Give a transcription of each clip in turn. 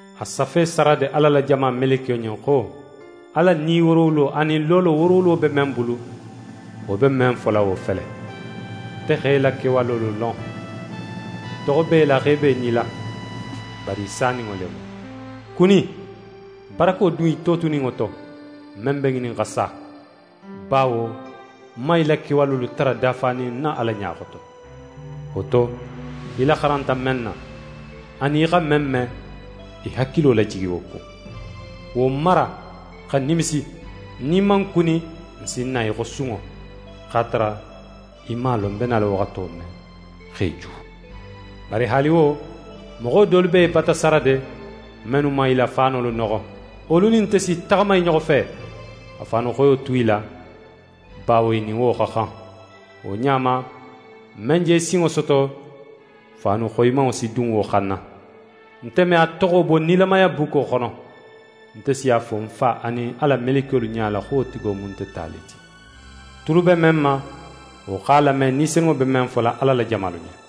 «A safe Sarade Ala la jama melekiyo ɲen xo: «Ala Ni woorowulo, anin loolo woorowulo be men bulu, wo be men fola wo fele: Nte x'é la kewalolu lon. Toxo b'é la xo í be í nila, bari í saninŋo le mu. Kuni! Barako dun í totuninŋo to, men be ŋinin xa sa, bawo ń man í la kewalolu tara dafanin ń na Ala ɲa xoto. Wo to, í laxaranta men na, anin í xa men me, í hakilo lajigi wo kun. Wo mara, xa nimisi! Nin í man kuni, ń si na í xo sunŋo, x'a tara í man a lon ń be nala waxato men, x'é ju. Bari haali wo, moxo dolu be í bata Sarade, mennu man i la faanolu noxo. Wolu nin nte si i taxama i ɲoxo fe, xa faanu xoyo tu i la, bawo i nin wo xa xan. «Wo ɲa ma, men je sinŋo soto, faanu xoyimanŋo si dun wo xanna. Nte me a toxo bo nilamaya bukko xono. Nte si a fo ń Fa anin a la melekiyolu ɲala xo wo tigo mu nte ta le ti. «Tulu be men ma, wo x'a lame, Ni Senunŋo be men fola Ala la jamalu ɲen!»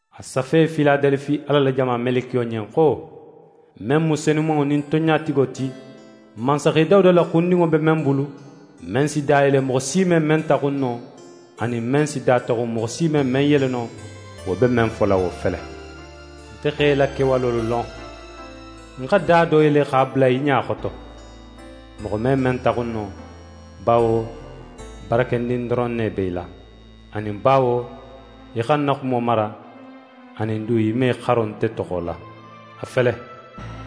«A safe Filadelifi Ala la jama melekiyo ɲen xo: «Men mu Senumanŋo nin Tonɲatigo ti, mansaxe Dawuda la xundinŋo be men bulu, men si da yele moxo si me men taxun no, anin men si da taxun moxo si me men yele no, wo be men fola wo fele: Nte x'é la kewalolu lon. Ń xa da do yele x'a bula í ɲa xoto, moxo me men taxun no, bawo barakendin doron ne be í la, anin bawo í xa ń na xumo mara, anin du í man í xaro nte toxo la. A fele,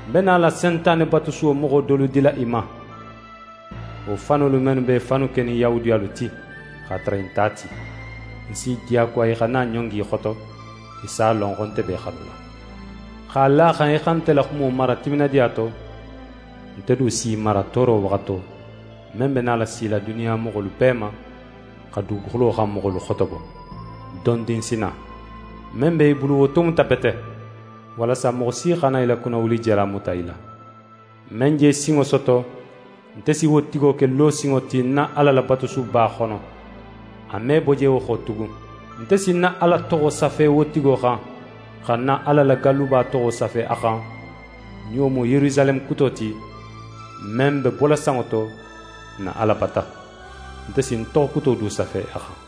ń be nala Sentane batusuwo moxo dolu dila í ma, wo fanolu mennu b'e fannu kenin Yahudiyalu ti, x'a tara i nte a ti: Ń si i diyakuwa i xa na ɲongi í xoto. I si a lon xo nte be í xanula. X'a la a xan í xa nte la xumo mara timinadiya to, nte du si í mara tooro waxato, men be nala sila duniya moxolu bee ma, xa duguxulo xan moxolu xotobo. Dondin ń si na. Men be í bulu wo tomuta bete, walasa moxo si xana í la kunnawulijala muta í la. «Men je sinŋo soto, nte si wo tigo ke losinŋo ti ń na Ala la batusuba xono. A me bo je wo xo tugun. Nte si ń na Ala toxo safe wo tigo xan, xa ń na Ala la galluba toxo safe a xan, nin wo mu Yerusaleme kuto ti, men be bola sanŋo to, ń na Ala bata. Nte si ń toxo kuto du safe a xan.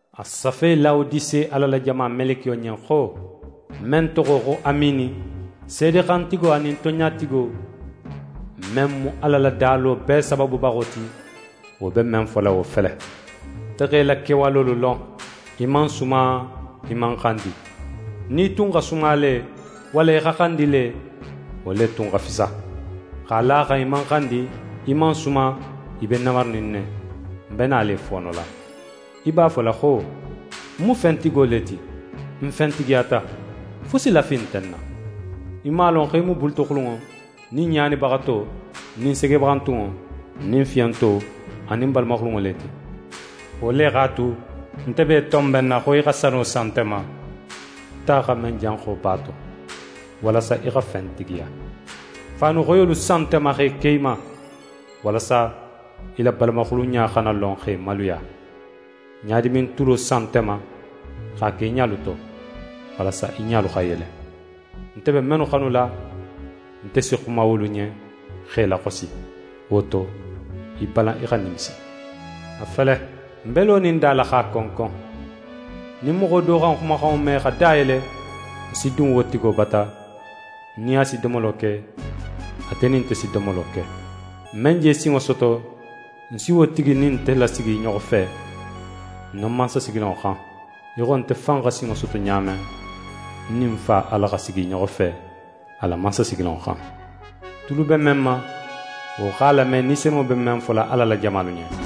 «A safe Lawodise Ala la jama melekiyo ɲen xo: «Men toxo xo Amiini, Seede xantigo, anin Tonɲatigo, men mu Ala la dalo bee sabaabubaxo ti, wo be men fola wo fele: Nte x'é la kewalolu lon: Í man suma, í man xandi. Nin í tun xa suma le, walla í xa xandi le, wo le tun xa fisa! X'a la a xan í man xandi, í man suma, í be namarinin ne, ń be nala í foonola. Í b'a fola xo: “Ń mu fentigo le ti, ń fentigiyata, fusi lafi nte ń na”. Í man a lon xo í mu bulutoxulunŋo nin ɲaanibaxato nin segebaxantunŋo nin fiyonto anin balamaxulunŋo le ti. Wo le x'a tu, nte be í tonbenna xo í xa sano san nte ma, ta xa men janxo b'a to, walasa í xa fentigiya. Faanu xoyolu san nte ma x'e ke í ma, walasa í la balamaxulunɲa xana lon x'é maluya. Ɲadimin tulo san nte ma x'a ke í ɲalu to, walasa í ɲalu xa yele. Nte be mennu xanula, nte si xuma wolu ɲen, x'e laxosi. Wo to, í balan í xa nimisi. A fele, ń be lonin da la x'a konkon; nin moxo do xa ń xumaxanŋo me xa da yele, ń si dun wo tigo bata, ń nin a si domolo ke, ate nin nte si domolo ke. «Men je sinŋo soto, ń si wo tigi nin nte lasigi i ɲoxo fe, ń na mansasigilanŋo xan, í xo nte fan xa sinŋo soto ɲa men, ń nin ń Fa Ala xa sigi i ɲoxo fe, a la mansasigilanŋo xan. «Tulu be men ma, wo x'a lame, Ni Senunŋo be men fola Ala la jamalu ɲen!»